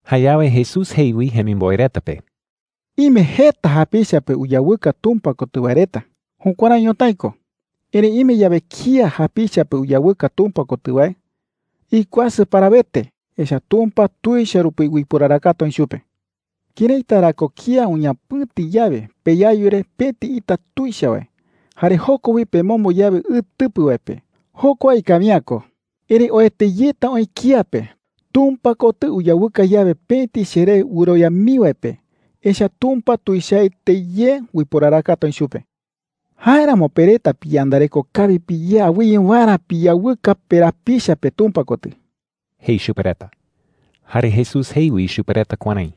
Jayawe Jesús jei wi jemimboe reta pe: “Ime jeta japicha pe uyawɨka Tumpa kotɨ wae reta. Jukuärái ñotái ko. Erëi ime yawe kía japicha pe uyawɨka Tumpa kotɨ wae, ¡ikuasɨ parawete! Echa’ä Tumpa tuicha rupi uiporarakata oï chupe,” jei. “¿Këraita ra ko kía uñapɨ̈ti yawe peyayu re pëti ita tuicha wae, jare joko wi pemombo yawe ɨ tɨpɨ wae pe? Jokua ikawi’ä ko. ¡Erëi oete yeta oï kía pe Tumpa kotɨ uyawɨka yawe pëti cheré wɨrowia mii wae pe! Echa’ä Tumpa tuichaete ye uiporarakata oï chupe,” jei. “Jáeramo pe reta piyandareko kawi piyé awɨye waerä piyawɨka perapicha pe Tumpa kotɨ,” jei chupe reta. Jare Jesús jei wi chupe reta kuärái: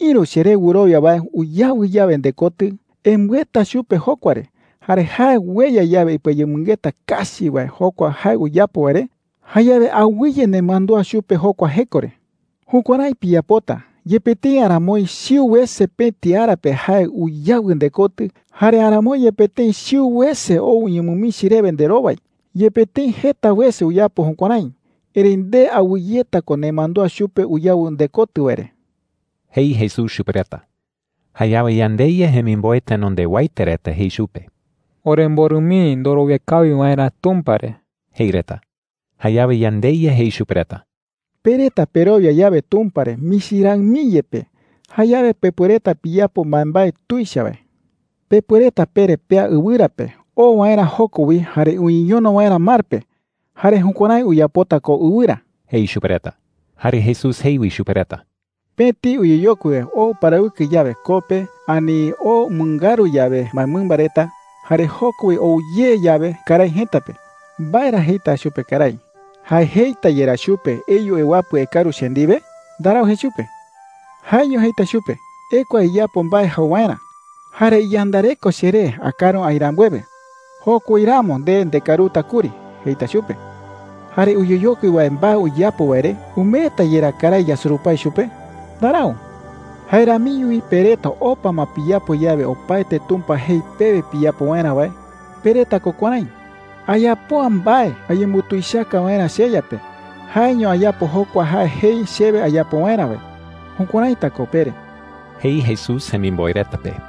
“Ïru cheré wɨrowia wae uyawɨ yawe ndekotɨ, embɨeta chupe jokua re. Jare jae ueya yawe ipɨayemɨngeta kachi wae jokua jae uyapo wae re, jayawe awɨye nemandúa chupe jokua jeko re,” jei. “Jukuärái piyapota, yepe tëi aramoi chiu wese pëti ara pe jae uyawɨ ndekotɨ, jare aramoi yepe tëi chiu wese ou uñemɨmichi rewe nderowai. Yepe tëi jeta wese uyapo jukuärái, erëi nde awɨyeta ko nemandúa chupe uyawɨ ndekotɨ wae re,” jei Jesús chupe reta. Jayawe yandeYa jemimboe tenondewaete reta jei chupe: “Oremborɨ mii ndorowia kawi waerä Tumpa re,” jei reta. Jayawe yandeYa jei chupe reta: “Pe reta perowia yawe Tumpa re michi raɨ mii yepe, jayawe pepuereta piyapo mbaembae tuicha wae,” jei. “Pepuereta pere pea ɨwɨra pe oo waerä joko wi jare uñeñono waerä mar pe. Jare jukuärái uyapota ko ɨwɨra,” jei chupe reta. Jare Jesús jei wi chupe reta: “Pëti uyeyokui wae oo uparawɨkɨ yawe koo pe ani oo umɨngaru yawe mbaemɨmba reta, jare joko wi ou ye yawe karái jëta pe, ¿mbae ra jeita chupe karái? ¿Jae jeita yerá chupe: ‘Eyu ewapɨ ekaru che ndiwe?’ Ndarau jei chupe,” jei. “Jaeño jeita chupe: ‘Ekua iyapo mbae jau waerä. Jare iyandareko cheré akaru aï rambuewe. Joko wi ramo nde ndekaruta kuri,’ jeita chupe. Jare uyeyokui wae mbae uyapo wae re ¿umeeta yerá karái yasurupái chupe? Ndarau,” jei. “Jae ramiño wi pe reta opa ma piyapo yawe opaete Tumpa jei pewe piyapo waerä wae, pereta ko kuärái: ‘Ayapo’ä mbae ayembutuichaka waerä cheYa pe. Jaeño ayapo jokua jae jei chewe ayapo waerä wae.’ Jukuäraita ko pere,” jei Jesús jemimboe reta pe.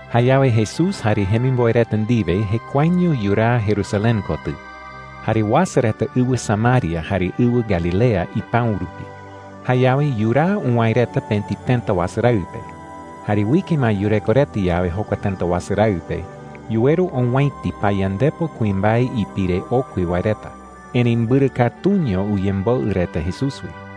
Jayawe Jesús jare jemimboe reta ndiwe jekuaeño yuraa Jerusalén kotɨ. Jare uasa reta ɨwɨ Samaria jare ɨwɨ Galilea ipäu rupi. Jayawe yuraa uwäe reta pëti tëta wasu raɨ pe. Jare uike ma yureko reta yawe jokua tëta wasu raɨ pe, yuweru owäiti payandepo kuimbae ipire okui wae reta. Erëi mbɨrɨ katuño uyemboɨ reta Jesús wi.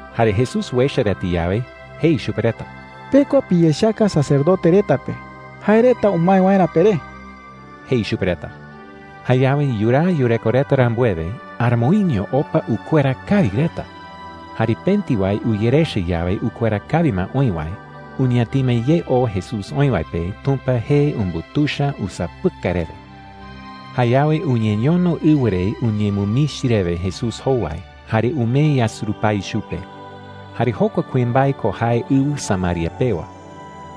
Jare Jesús uecha reta yawe, jei chupe reta: “Pekua piyechaka sacerdote reta pe, jae reta umae waerä peré,” jei chupe reta. Jayawe yuraa yureko reta rambuewe, ¡aramoiño opa ukuera kawi reta! Jare pëti wae uyerecha yawe ukuera kawi ma oï wae, uñatima ye ou Jesús oï wae pe Tumpa jee umbutuicha usapɨkai rewe. Jayawe uñeñono ɨwɨ re uñemɨmichi rewe Jesús jowai jare umee yasurupái chupe. Jare jokua kuimbae ko jae ɨwɨ Samaria pewa.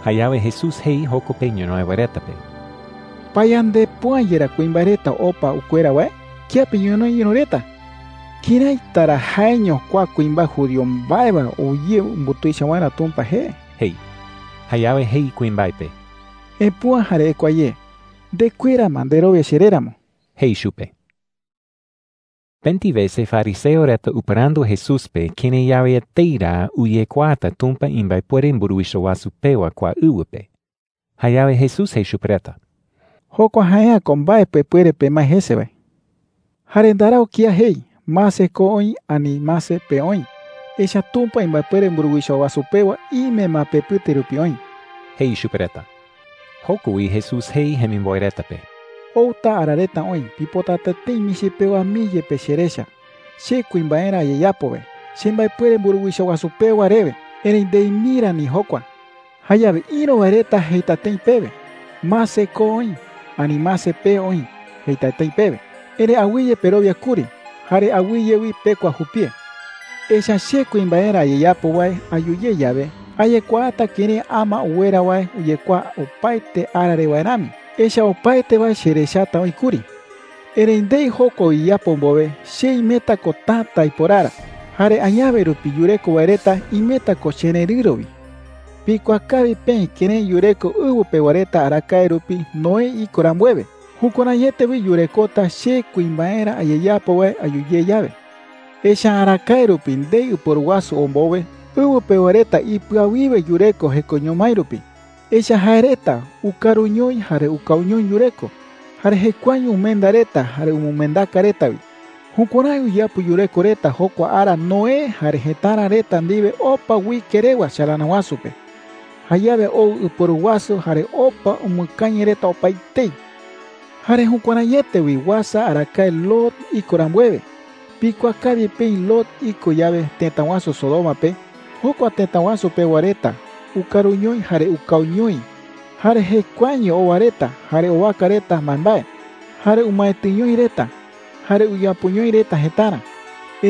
Jayawe Jesús jei joko pe ñonoï wae reta pe: “¿Payandepo’ä yerá kuimbae reta opa ukuera wae? ¿Kiape ñonoï ïru reta? ¿Këraita ra jaeño kua kuimbae judío mbae wae ou ye umbutuicha waerä Tumpa jee?” jei. Jayawe jei kuimbae pe: “Epüa jare ekua ye. Ndekuera ma nderowia cheré ramo,” jei chupe. Pëti wese fariseo reta upɨrandu Jesús pe kërái yawe etei ra uyekuaata Tumpa imbaepuere mburuwicha wasu pewa kua ɨwɨ pe. Jayawe Jesús jei chupe reta: “Jokua jae’ä ko mbae pepuere pemae jese wae,” jei. “Jare ndarau kía jei: ‘Mase, ko oï,’ ani, ‘Mase, pee oï.’ Echa’ä Tumpa imbaepuere mburuwicha wasu pewa ime ma pepɨte rupi oï,” jei chupe reta. Joko wi Jesús jei jemimboe reta pe: “Outa oï ara reta pipotata tëi michi pewa mii yepe cherecha, che kuimbaerä ayeyapo wae, chembaepuere mburuwicha wasu pewa rewe. Erëi ndei mii rani jokua,” jei. “Jayawe ïru wae reta jeita tëi pewe: ‘Mase, ko oï,’ ani ‘Mase, pee oï,’ jeita tëi pewe. Erëi awɨye perowia kuri. Jare awɨye wi pekua jupie. Echa’ä che kuimbaerä ayeyapo wae ayu ye yawe, ayekuaata kërái ama uwera wae uyekuaa opaete ara re wae rami. Echa’ä opaete wae cherechata oï kuri,” jei. “Erëi ndei jokua uyeyapo mbowe, che imeta ko täta aiporara, jare añawe rupi yureko wae reta imeta ko chererɨ̈ro wi,” jei chupe reta. “Pikuaa kawi peï kërái yureko ɨwɨ pewa reta arakae rupi Noé iko rambuewe. Jukuäraiete wi yurekota che kuimbaerä ayeyapo wae ayu ye yawe,” jei. “Echa’ä arakaete rupi, ndei ɨporu wasu ou mbowe, ɨwɨ pewa reta ipɨawiwe yureko jekoño mái rupi. Echa’ä jae reta ukaruñoi jare ukauñoi yureko. Jare jekuaeño umenda reta jare umɨmendaka reta wi. Jukuärái uyapo yureko reta jokua ara Noé jare jëtara reta ndiwe opa uike rewa chalana wasu pe. Jayawe ou ɨporu wasu jare opa umɨkañɨ reta opaetei,” jei chupe reta. “Jare jukuäraiete wi uasa arakae Lot iko rambuewe. Pikuaa kawi peï Lot iko yawe tëta wasu Sodoma pe, jokua tëta wasu pewa reta ukaruñoi jare ukauñoi, jare jekuaeño owa reta jare owaka reta mbaembae, jare umaetɨñoi reta, jare uyapoñoi reta jëtarä,” jei.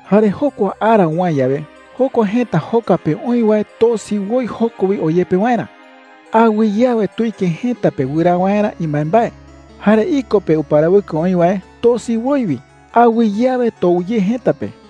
“Jare jokua ara uwäe yawe, jokua jëta joka pe oï wae tosi woi joko wi oyepe waerä. Awɨye awe tuike jëta pe wɨraa waerä imbaembae. Jare iko pe uparawɨkɨ oï wae tosi woi wi. Awɨye awe tou ye jëta pe,” jei.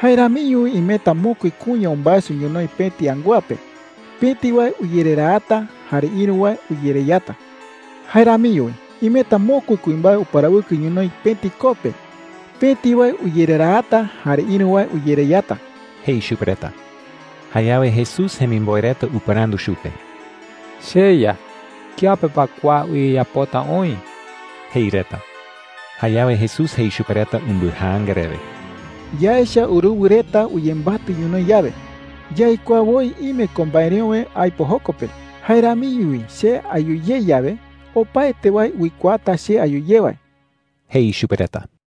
“Jae ramiño wi imeta mokui kuña umbaeso ñonoï pëti angúa pe. Pëti wae uyereraata, jare ïru wae uyereyata,” jei. “Jae ramiño wi imeta mokui kuimbae uparawɨkɨ ñonoï pëti koo pe. Pëti wae uyereraata, jare ïru wae uyereyata,” jei chupe reta. Jayawe Jesús jemimboe reta upɨrandu chupe: “CheYa, ¿kiape pa kua uyeyapota oï?” jei reta. Jayawe Jesús jei chupe reta umbɨjaanga rewe: “Yaecha uruwɨ reta uyembatɨ ñonoï yawe, yaikuaa woi ime ko mbaereöwe aipo joko pe. Jae ramiño wi che ayu ye yawe, opaete wae uikuaata che ayu ye wae,” jei chupe reta.